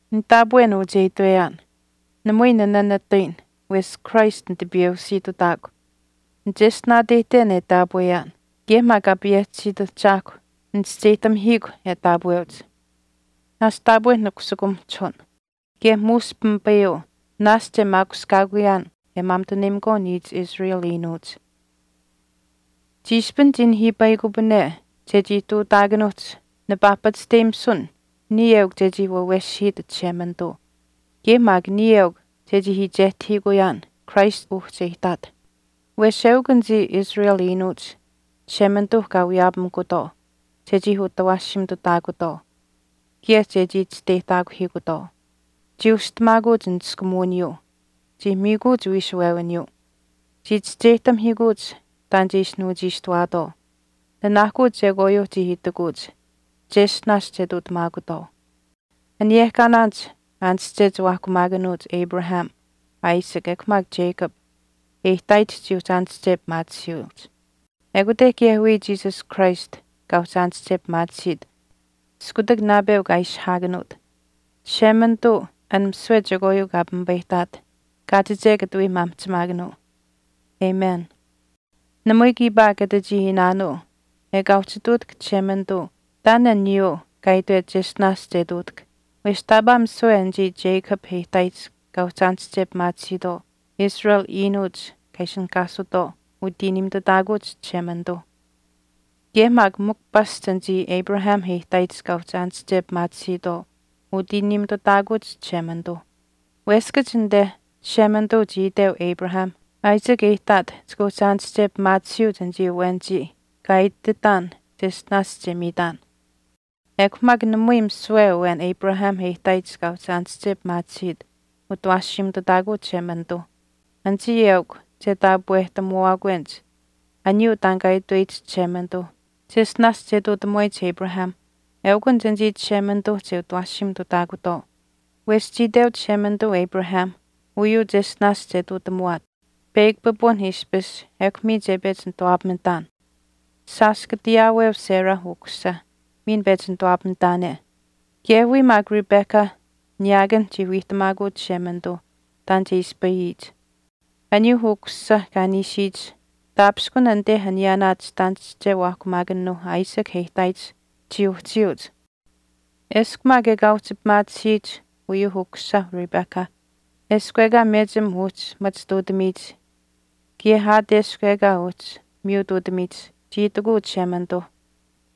Nitaapwen uu che itweyaan. Namui ninanatayin wesh Christ nitipiyeusiitutaakw. Nicheshtinaateyihten e taapweyaan kaye maak Kaa payehchisiit Ahchaahkw nichischeyihtamihiikw e taapweuch. Naashch taapwe nikusukumahchihun kaye muush pimipayuu naashch e maakushkaakuyaan e maamituneyimakwaau niich Israel iinuuch. Chiishpin chii nihiipayikupane chechii ihtuutaakanuuhch nipaa pachishteyimisun niya eukw chechii waaweshihiit Chishemanituu kaye maak niya eukw chechii iichehtahiikuyaan Christ uhchi e ihtaat. Wesh eukw anichii Israel iinuuch Chishemanituuh kaa wiyaapamikutwaau chechii utawaashiimituutaakutwaau kaye chechii chisteyihtaakuhiikutwaau. Chii ushihtamaakuch niskumuwiniyuu. Chii miikuuch wiishuwewiniyuu. Chii chischeyihtamihiikuuch taan che ishi nuuchiishtuwaatwaau. Nanaahkuu chekwaayuuh chii itikuuch cheshtinaash che ihtuutamaakutwaau. Aniyehkaanaanich aanische chiwaahkumaakanuuh Abrahamh, Isaac ekw maak Jacob e ihtaayihch chii uhchi aanische pimaatisiyuuch. Ekute kaye wiya Jesus Christ kaa uhchi aanische pimaatisiit iskutak naapeu kaa ishihaakanuut. Chishemanituu an misiwe chekwaayuu kaa pimipayihtaat, kaachiche katawii maamihchimaakanuu. Amen. Namui kiipaa kata chii iinaanuu ekaa uhchi ihtuutahk Chishemanituu taan aniyuuh kaa itwet cheshtinaash che ihtuutahk wesh taapaa misiwe anichii Jacob e ihtaayich kaa uhchi aanische pimaatisiitwaau, Israel iinuuch kaa ishinihkaatisutwaau utiiniimitutaakuuch Chishemanituuh. Kaye maak mikw pasch anichii Abraham e ihtaayich kaa uhchi aanische pimaatisiitwaau utiiniimitutaakuuch Chishemanituu. Weskach anite, Chishemanituu chii iteu Abrahamh, “Isaac e ihtaat chika uhchi aanische pimaatisiyuuch anichii awenichii kaa ititaan cheshtinaash che miitaan.” Ekw maak namui misiwe awen Abrahamh e ihtaayich kaa uhchi aanische pimaatisiit utawaashiimitutaakuu Chishemanituu. Anichii eukw che taapwehtamuwaakwenich aniyuu taan kaa itweyich Chishemanituuh cheshtinaash che ihtuutamuwaayich Abrahamh eukunich anichii Chishemanituuh che utawaashiimitutaakutwaau. Wesh chii iteu Chishemanituu Abrahamh uyuu cheshtinaash che ihtuutamuwaat, “Peyakw pipun ishpish ekw miin che pechi nituwaapamitaan. Shaash kata ayaaweu Sarah ukusisa miin pechi nituwaapamitaane.” Kaye wiya maak Rebecca niyaakan chii wiihtamaakuu Chishemanituuh taan che ispayiyich. Aniyuuh ukusisa kaa niishiyich taapishkun anite aniyaanaa chitaanische waahkumaakanuuh Isaac e ihtaayich chii uhchiyuuch. Eshkw maak ekaa uhchi pimaatisiyich uyuuh ukusisa Rebecca, “Eshkw ekaa mechim uhchi machituutamiyich kaye aat eshkw ekaa uhchi miyutuutamiyich,” chii itikuu Chishemanituuh,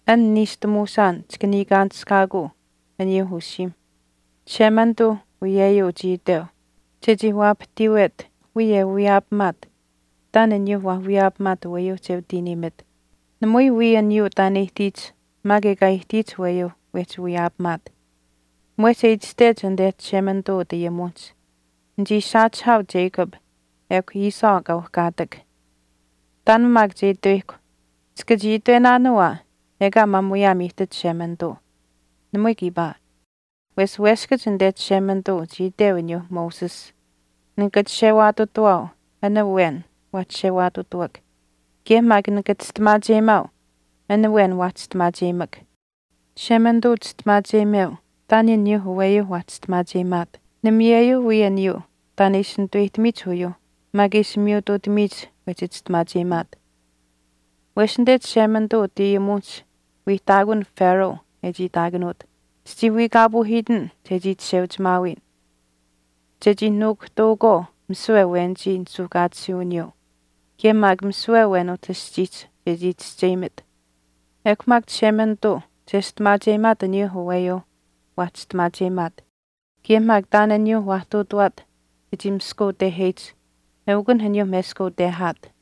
An Niishtamuusaan chika niikaanishkaakuu aniyuuh usiimh. Chishemanituu uyeyuu chii iteu chechii waapahtiiwet wiya e wiyaapamaat taan aniyuuh waah wiyaapamaat aweyuu che utiiniimit, namui wii aniyuu taan e ihtiyich maak ekaa e ihtiyich aweyuuh wehchi wiyaapamaat. Mwehch e itashtech anite Chishemanituu utayimuwinihch, “Nichii saachihaau Jacob ekw Esau kaa uhkaatak.” Taan maak che itweyihkw, chika chii itwenaanuu aa ekaa maamuyaam ihtit Chishemanituu. Namui kiipaa. Wesh weskach anite Chishemanituu chii iteu aniyuu Moses, “Nika chishewaatutawaau an awen waa chishewaatutuuk kaye maak nika chistimaacheyimaau an awen waa chistimaacheyimak.” Chishemanituu chistimaacheyimeu taan aniyuuh aweyuuh waa chistimaacheyimaat. Namayeyuu wii aniyuu taan e ishi nituweyihtamiyich uyuuh maak e ishi miyutuutamiyich wehchi chistimaacheyimaat. Wesh anite Chishemanituu utayimuwinihch wiihtaakun Pharaoh e chii itaakanuut, “Chichii wiikaapuuhiitin chechii chisheuchimaawiyin chechii nuukuhtaukwaau misiwe awenichii nisuuhkaatisiiwiniyuu kaye maak misiwe awen utah aschiihch chechii chischeyimit.” Ekw maak Chishemanituu chestimaacheyimaat aniyuuh aweyuuh waa chistimaacheyimaat, kaye maak taan aniyuuh waa ihtuutawaat chechii miskauteheyich eukunh aniyuuh meskautehaat.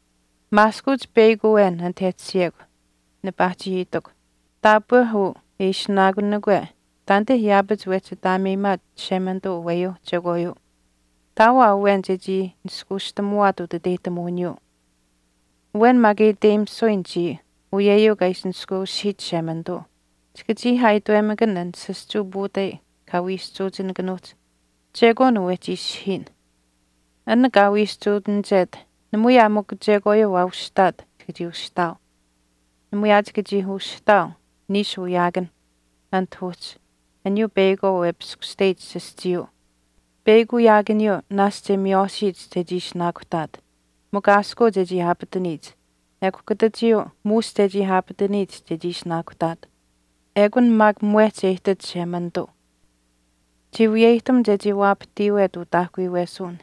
Maaskuuch peyakw awen anit e tashiyekw nipaa chii itikw, “Taapwe uu e ishinaakunikwe taanite yaapach wehchi ataameyimaat Chishemanituu aweyuuh chekwaayuu. Ihtaau aa awen chechii niskaustamuwaat utiteyihtamuwiniyuu.” Awen maak e iteyimisuyin chiya uyeyuu kaa ishi nishkweushihiit Chishemanituu. Chika chii aa itwemakan an saschuu puutai kaa wiischuuchinikanuuhch, “Chekwaan uu wehchi ishihiyin.” An kaa wiischuutinichet namui aa mikw chekwaayuu waa ushitaat chika chii ushihtaau. Namui aa chika chii ushihtaau niishu wiyaakanh anit uhchi aniyuu peyakwaau e piskushteyich sischiyuu. Peyakw wiyaakaniyuu naashch e miywaashiyich chechii ishinaakuhtaat mikw aaskuu chechii aapataniyich ekw kutachiyuu muush chechii aapataniyich chechii ishinaakuhtaat. Ekun maak mwehch e ihtit Chishemanituu. Chii wiyeyihtam chechii waapahtiiwet utaahkuyuwesuwin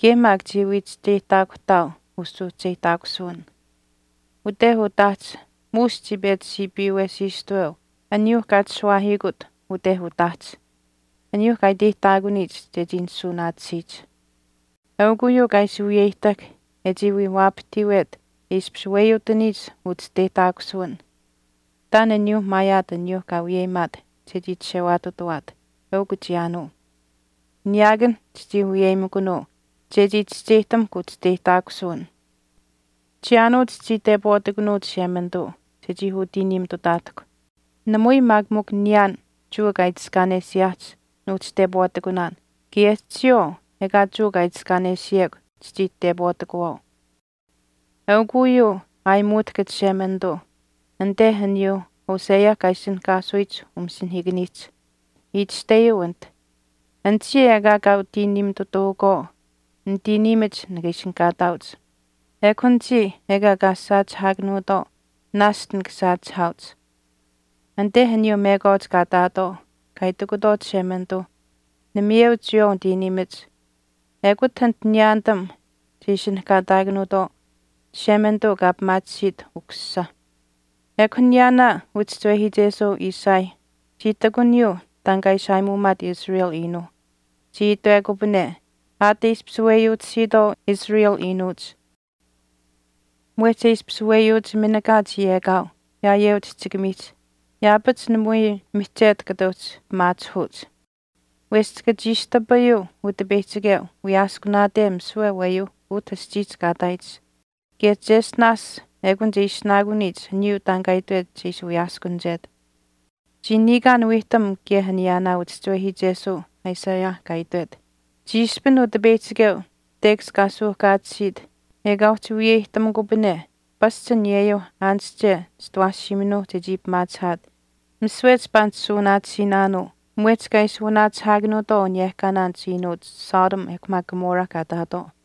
kaye maak chii wii chischeyihtaakuhtaau usuuhcheyihtaakusuwin. Ute utaahch muush chii pechi siipiiwesiistuweu aniyuuh kaa chishuwaahiikut ute utaahch, aniyuuh kaa iteyihtaakuniyich chechii nisuunaatisiyich. Eukw uyeyuu kaa ishi wiyeyihtahk e chii wii waapahtiiwet e ishpish weyuutaniyich uchisteyihtaakusuwin taan aniyuuh maayaat aniyuuh kaa wiyeyimaat chechii chishewaatutawaat, eukw chiyaanuu. Niyaakan chichii wiyeyimikunuu chechii chischeyihtamukw uchisteyihtaakusuwin. Chiyaanuu chichii tepwaatikunuu Chishemanituu chechii utiiniimitutaatahkw. Namui maak mikw niyaan Jewa kaa itiskaanesiyaahch nuuhchi tepwaatikunuu kaye chiyawaau ekaa Jewa kaa itiskaanesiyekw chichii tepwaatikuwaau. Eukw uyuu aayimuutahk Chishemanituu anite aniyuuh Hosea kaa ishinihkaasuyich utayimuwiniihch. Itashteyuu anit, Anichii ekaa kaa utiiniimitutaukwaau, nitiiniimach nikaa ishinihkaataauch. Ekw anichii ekaa kaa saachihaakanuutwaau naashch nika saachihaauch. Anit aniyuu mekwaach kaa ihtaatwaau kaa itikutwaau Chishemanituu, namayeu chiyawaau nitiiniimach ekut anit niyaanitam che ishinihkaataakanuutwaau Chishemanituu kaa pimaatisiit ukusisah. Ekw aniyaanaa uchischiwehiichesuu Isaiah chii ihtakuniyuu taan kaa ishi aayimuumaat Israel iinuuh. Chii itwekupane, Aat e ishpish weyuutisiitwaau Israel iinuuch mwehch e ishpish weyuuch minikaach yekaau yaayeu chihchikamiihch yaapach namui mihchetu kata uhchi pimaachihuuch. Wesh chika chiistapayuu Utipeyihchikeu wiyaaskunaate misiwe aweyuuh utah aschiihch kaa ihtaayich kaye cheshtinaash ekun che ishinaakuniyich aniyuu taan kaa itwet che ishi wiyaaskunichet. Chii niikaan wiihtam kaye aniyaanaa uchischiwehiichesuu Isaiah kaa itwet, Chiishpin Utipeyihchikeu tekash kaa suuhkaatisiit ekaa uhchi wiyeyihtamikupane pasch aniyeyuu aanische chitawaashiiminuuh chechii pimaachihaat misiwe chipaa nishuunaatisiinaanuu mwehch kaa ishi wanaachihaakanuutwaau aniyehkaanaanich iinuuch Sodom ekw maak Gomorrah kaa ihtaatwaau.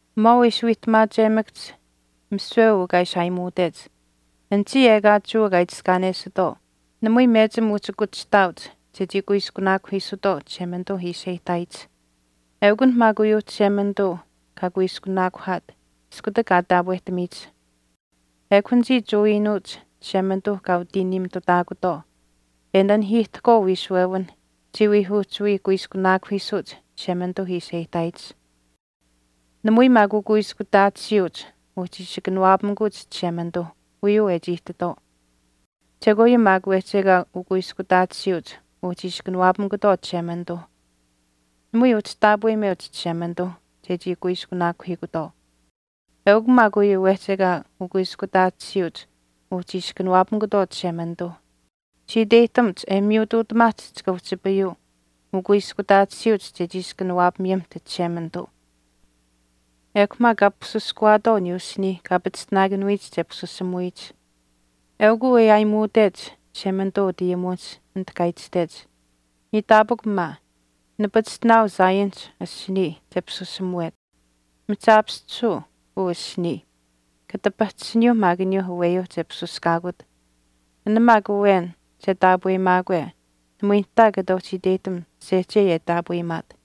Mwaau e ishi wiihtamaachemakahch misiwe uu kaa ishi aayimuutech, anichii ekaa Jewa kaa itiskaanesitwaau namui mechim uhchi kuchihtaauch chechii kuiskunaakuhiisutwaau Chishemanituu ishi e ihtaayich. Eukunh maak uyuu Chishemanituu kaa kuiskunaakuhaat iskutak kaa taapwehtamiyich. Ekw anichii Jewa iinuuch Chishemanituuh kaa utiiniimitutaakutwaau, e nanihiihtahkwaau wiishuwewinh chii wii uhchi wii kuiskunaakuhiisuuch Chishemanituu ishi e ihtaayich. Namui maak ukuiskutaatisiiuch uhchi ishi kanawaapamikuuch Chishemanituuh uyuu e chii ihtitwaau. Chekwaayuu maak wehchi ekaa ukuiskutaatisiiuch uhchiish kanawaapamukutwaau Chishemanituuh. Namui uhchi taapweyimeuch Chishemanituuh chechii kuiskunaakuhiikutwaau. Eukw maak uyuu wehchi ekaa ukuiskutaatisiiuch uhchi ishi kanawaapamikutwaau Chishemanituuh. Chii iteyihtamuch e miyutuutamaahch chika uhchipayuu ukuiskutaatisiiuch chechii ishi kanawaapamiyimiht Chishemanituu. Ekw maak kaa pisuskuwaatwaau aniyuuh asiniih kaa pachishtinaakanuyich che pisusamuweyich. Eukuu e aayimuutech Chishemanituu umasinihiikanihch anit kaa itashtech, Iitaapikw maa, nipachishtinaau Zionihch asinii che pisusamuwet. Mihchaapischisuu uu asinii, kata pahchishiniyuuh maak aniyuuh aweyuu che pisuskaakut. An maak awen che taapweyimaakwe namui nihtaa kata uhchi iteyihtam sehchei e taapweyimaat.